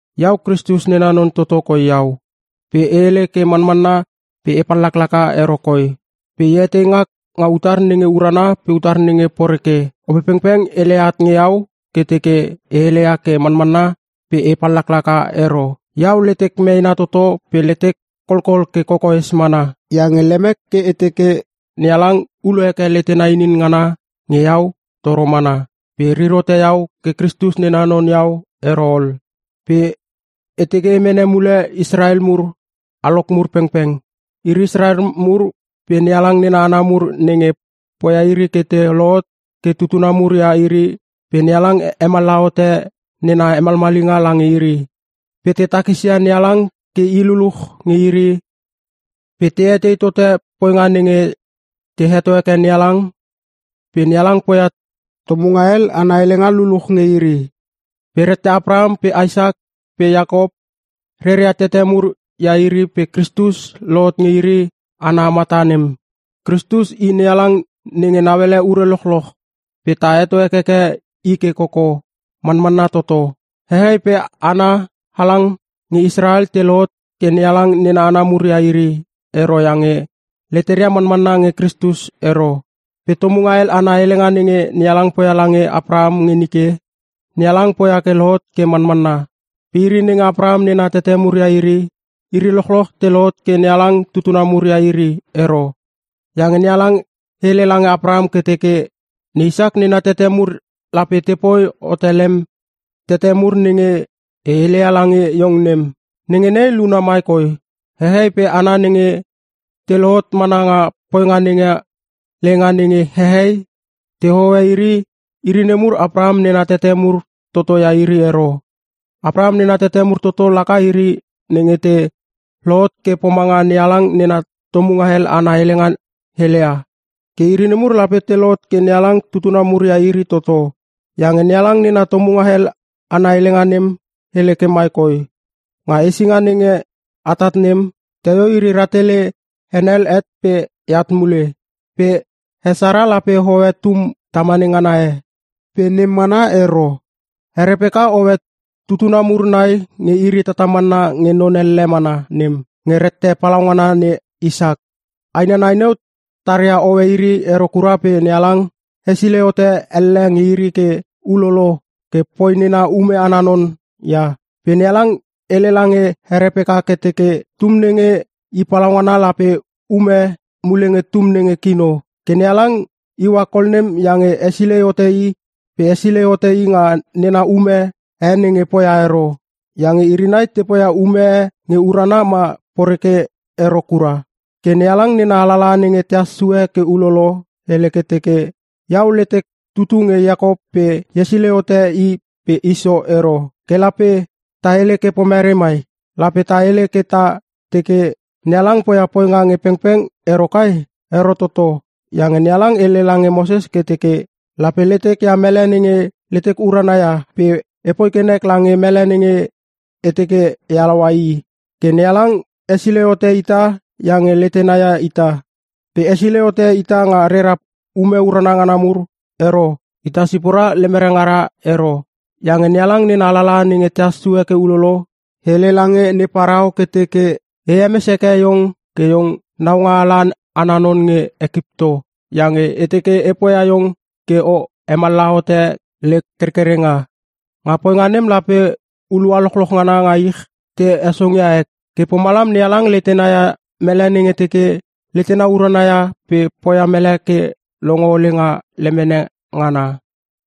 Iau Kristus nena non toto koi iau. Pe e hele ke manmanna pe e pallaklaka ero koi. Pe e etei ngak nga utar nenge urana pe utar nenge poreke, Opepengpeng heleia at nge iau ke teke e hele ke manmanna pe e pallaklaka ero. Iau letek meena toto pe letek kolkol ke kokoes mana. Iange lemek ke e teke NeHalang ulo heke letena inin ngana nge iau toro mana pe rir hote iau ke Kristus nena non iau ero ol. Pe e teke mene mule Israel mur, alok mur pengpeng. Iri Israel mur pe NeHalang nena hana mur nenge poia iri ke te lohot ke tutuna mur ia iri pe NeHalang hemallaha hote nena hemalmalinga lange iri. Pe te takisia NeHalang ke i luluch nge iri pe te mene nena hotonga mur pe te etei tote poinga nenge te heto heke NeHalang pe NeHalang poia tomunga hel ana helenga luluch nge iri. Pe rette Apraham pe Isak pe Iakop reria tete mur ia iri pe Kristus lohot nge iri hana ana mata nem. Kristus i NeHalang nenge nauele ure lochloch pe ta heto hekeke i ke koko! Manmanna toto. Hehei pe hana halang nge Israel te lohot ke NeHalang nena hana mur ia iri ero iange leteria manmanna nge Kristus ero. Pe tomunga hel ana helenga nenge NeHalang poia lange Apraham nge nike, NeHalang poia ke lohot ke manmanna. Pe iri nenge Apraham nena tete mur ia iri, iri lochloch te lohot ke NeHalang tutuna mur ia iri ero. Iange NeHalang hele lange Apraham ke teke, “Ne Isak nena tete mur lape te poi hote lem tete mur nenge e heleia lange iong nem.” Nenge nei luna mai koi: Hehei pe hana nenge te lohot mana nga poinga nenga leinga nenge hehei te hohoe iri, iri nemur Apraham nena tete mur toto ia iri ero. Apraham nena tete mur toto laka iri nenge te lohot ke pomanga NeHalang nena tomunga hel ana helenga heleia. Ke iri nemur lape te lohot ke NeHalang tutuna mur ia iri toto. Iange NeHalang nena tomunga hel ana helenga nem hele ke mai koi: “Nga hesinga nenge atat nem, teio iri rahtele henel het pe eat mule. Pe he Sara lape hoe tum tamane ngana e.” Pe nem mana ero. He Repeka hoe tutuna mur nai nge iri tatamanna nge non elle mana nem. Nge rette palaungana ne Isak. Aina nai neu taria hoe iri ero kura pe NeHalang hesilei hote elle nge iri ke ulolo ke poi nena ume ana non ia. Pe NeHalang hele lange he Repeka ke teke, “Tum nenge i palaungana lape ume mule nge tum nenge kino.” Ke NeHalang iua kol nem iange hesilei hote i pe hesilei hote i nga nena ume e nenge poia ero. Iange iri nai te poia ume e nge urana ma poreke ero kura. Ke NeHalang nena alalaha nenge tehas sue ke ulolo, hele ke teke, “Iau letek tutu nge Iakop pe e hesilei hote i pe Iso ero.” Ke lape ta hele ke pomerei mai? Lape ta hele ke ta teke NeHalang poia poinga nge pengpeng ero kai? Ero toto! Iange NeHalang hele lange Moses ke teke, “Lape letek ia mele nenge letek urana ia pe epoi ke nek lange mele nenge e teke e halaua i.” Ke NeHalang hesilei hote ita iange letena ia ita. Pe hesilei hote ita nga rera ume urana ngana mur ero pe nga ita sipora lemera ngara ero. Iange NeHalang nena alalaha nenge tehas sue ke ulolo, hele lange ne Parao ke teke, “E hemes heke iong ke iong naungaala ana non nge Ekipto, iange e teke e poia iong ke o hemallaha hote lek kerkerenga. Nga poinga nem lape hulua lochloch ngana nga ich te hesongia ek.” Ke pomalam NeHalang letena ia mele nenge teke letena urana ia pe poia mele ke longo ole nga lemene ngana.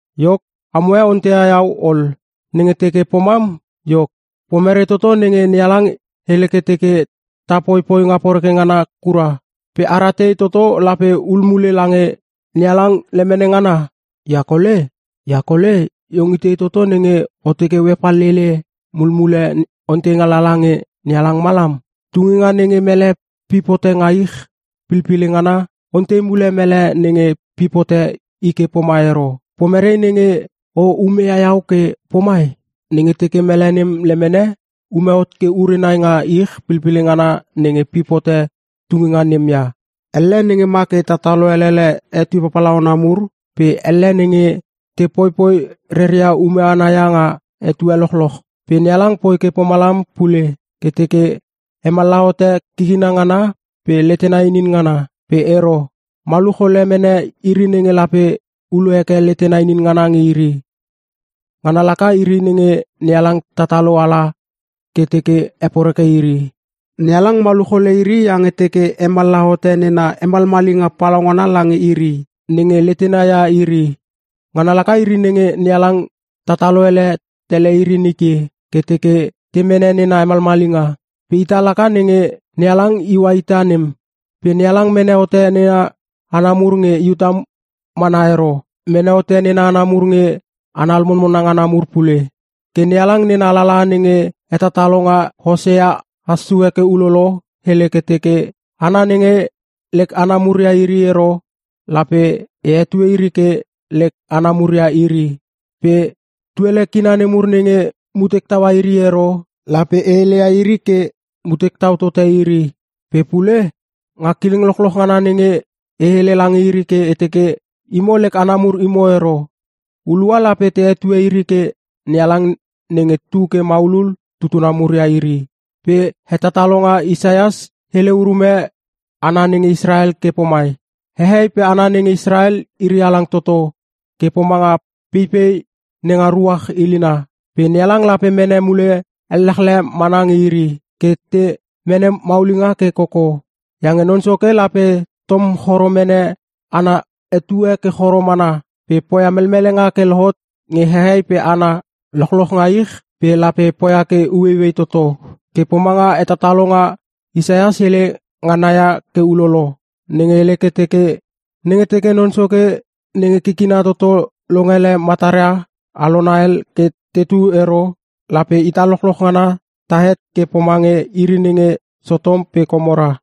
Iok, amoe onteia iau ol, “Nenge teke pomam, iok, pomerei toto nenge NeHalang hele ke teke ta popoi poinga poreke ngana kura? Pe ara tei toto lape hul mule NeHalang lemene ngana?” Ia kole iong itei toto nenge o teke o hepallele mulmule onteinga lala nge NeHalang malam? Tuninga nenge mele pip hote nga ich pilpile ngana, ontei mule mele nenge pip hote i ke pomai ero, “Pomerei nenge o umeia iau ke pomai?” Nenge teke mele nem lemene ume hot ke ure nai nga ich pilpile ngana nenge pip hot tuninga nem ia. Elle nenge ma ke tatalo elele etue papalauna mur pe elle nenge te poipoi reria ume ana ia nga etue lochloch. Pe NeHalang poi ke pomalam pule ke teke hemallaha hote kikina ngana pe letena inin ngana. Pe ero. Maluch ole mene iri nenge lape ulo heke letena inin ngana nge iri. Ngana laka iri nenge NeHalang tatalo ala ke teke heporeke iri. NeHalang maluch ole iri iange teke hemallaha hote nena hemalmalinga palaungana lange iri nenge letena ia iri. Ngana laka iri nenge NeHalang tataloele tele iri nike ke teke te mene nena hemalmalinga. Pe ita laka nenge NeHalang iua ita nem. Pe NeHalang mene hote nena hana mur nge Iuta mana ero, mene hote nena hana mur nge hana lomonmona ngana mur pule. Ke NeHalang nena alalaha nenge hetatalonga Hosea has sue ke ulolo, hele ke teke, “Hana nenge lek hana mur ia iri ero, Lape e hetue iri ke ‘lek hana mur ia iri.’ Pe tuele kina nemur nenge mutek taua iri ero, lape e hele ia iri ke, ‘Mutek tau tote iri.’” Pe pule, “Nga kileng lochloch ngana nenge E hele lange iri ke e teke, ‘Imo lek hana mur imo ero.’ Hulua lape te hetue iri ke ‘NeHalang nenge tu ke maulul tutuna mur ia iri.’” Pe hetatalonga Isaias hele urume hana nenge Israel ke pomai: “Hehei pe hana nenge Israel iri halang toto ke pomanga peipei nenga ruach ilina, pe NeHalang lape mene mule ellechle mana nge iri ke te mene maulinga ke koko. Iange Non Soke lape tom choro mene ana etue ke choro mana pe poia melmelenga ke lohot nge hehei pe hana lochloch nga ich pe lape poia ke ueiuei toto.” Ke pomanga hetatalonga Isaias hele ngana ia ke ulolo, nenge hele ke teke, “Nenge teke Non Soke nenge kikina toto longele matara alona hel ke tetu ero lape ita lochloch ngana tahet ke pomange iri nenge Sotom pe Komora.”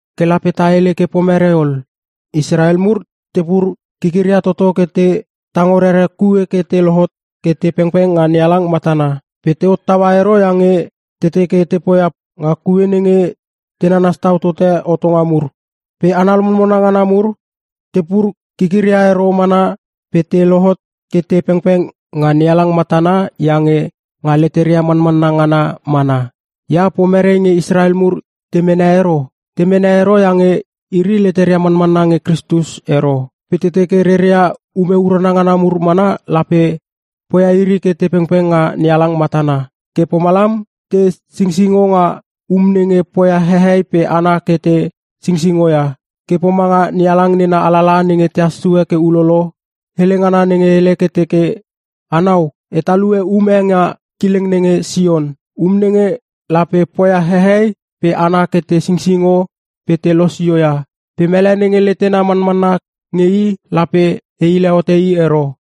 Ke lape ta hele ke pomerei ol? Israel mur tepur kikiria toto ke te tango rere kue ke te lohot ke te pengpeng nga NeHalang matana. Pe te hottaua ero iange te teke te poia nga kue nenge te nanas tau tote hotonga mur. Pe hana lomonmona ngana mur tepur kikiria ero mana pe te lohot ke te pengpeng nga NeHalang matana iange nga leteria manmanna ngana mana. Ia pomerei nge Israel mur te mene ero? Te mene ero iange iri leteria manmanna nge Kristus ero. Pe te teke reria ume urana ngana mur mana lape poia iri ke te pengpeng nga NeHalang matana. Ke pomalam te singsingo nga “um nenge poia hehei pe hana ke te sisingo ia”. Ke pomanga NeHalang nena alalaha nenge tehas sue ke ulolo, hele ngana nenge hele ke teke, “Anau, e talue um e nga kileng nenge Sion. Um nenge lape poia hehei pe hana ke te singsingo pe te losio ia. Pe mele nenge letena manmanna nge I lape e hile hote i ero.”